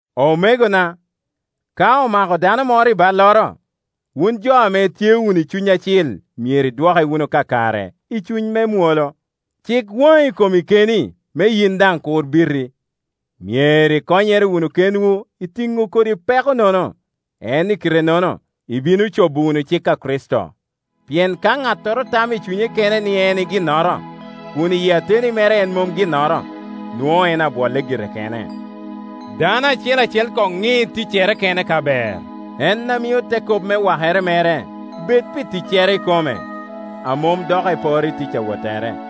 Omegona, ka omako dano moro i balloro, wun jo ame itye wunu i Cuny Acil myero idwoke wunu kakare i cuny me mwolo. Cik wani i komi keni, me yin daŋ kur biti. Myero ikonyere wunu kenwu i tino kodi peko-nono; en i kite-nono ibino cobo wunu cik a Kricito. Pien ka ŋattoro tamo i cunye kene ni en e ginnoro, kun iyi ateni mere en mom ginnoro, nwoŋo en abwolle gire kene. Dano acel acel koŋ ŋi ticcere kene ka ber, en a mio te kop me wakere mere bed pi ticcere ikome, a mom dok eporo i tic awottere.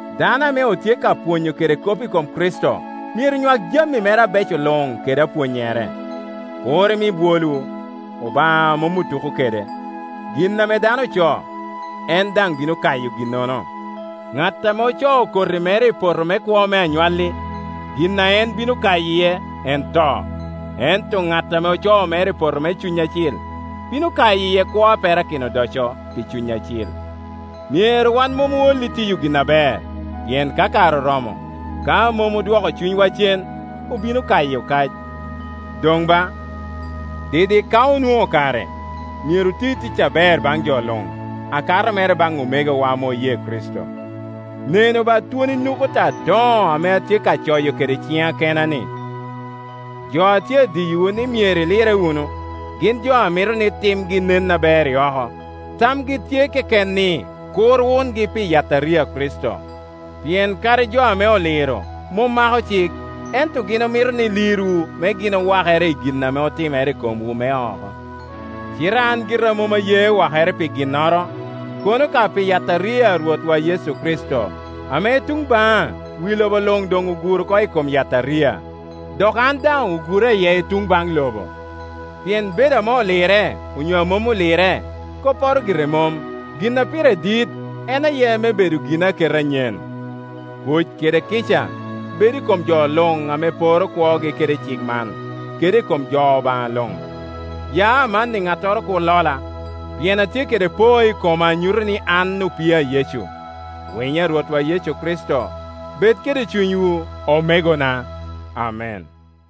Dano ame otye ka pwonyo kede kop i kom Kricito myero nywak jami mere abeco luŋ kede apwonnyere. Kur imi bwolwu; Obaŋa mom otuko kede. Gin ame dano ocoo, en daŋ bino kayo ginnono, ŋat ame ocoo koti mere i poto me kwo me anywalli, gin ame en bino kayo iye en to; ento ŋat ame ocoo mere i poto me Cuny Acil, bino kayo iye kwo a perakino odoco pi Cuny Acil. Myero wan mom ool i tiyo gin aber, pien ka kare oromo, ka mom odwoko cunywa cen, obino kayo kac. Doŋ ba, didik ka onwoŋo kare, myero oti tic aber baŋ jo luŋ, akato mere baŋ omegowa ame oye Kricito. Nenu ba twoni nukuta adoŋo ame atye ka coyo kede ciŋa kena-ni! Jo a tye adiyowu ni myero ilirre wunu, gin jo a mito ni timgi nen aber i oko. Tamgi tye keken ni kur wungi pi yataria a Kricito. Pien kadi jo ame oliro mom mako cik, ento gin omito ni lirwu me gin owakere i gin ame otimere i komwu me oko. Cite an gira mom aye wakere pi ginnoro, kono ka pi yataria a Rwotwa Yecu Kricito, ame i tuŋ baŋa wi lobo luŋ doŋ ogur oko i kom yataria, dok an daŋ ogura iye i tuŋ baŋ lobo. Pien bedo ame olirre onyo a mom olirre kopporo gire mom; gin a pire dit en aye me bedo ginaketa anyen. Kuc kede kica bed i kom jo luŋ ame poro kwogi kede cik man, kede i kom jo Obaŋa luŋ. Ya amanni ŋattoro kur lola, pien atye kede poo i koma a nyuto ni an opii a Yecu. Winyo a Rwotwa Yecu Kricito bed kede cunywu, omegona. Amen.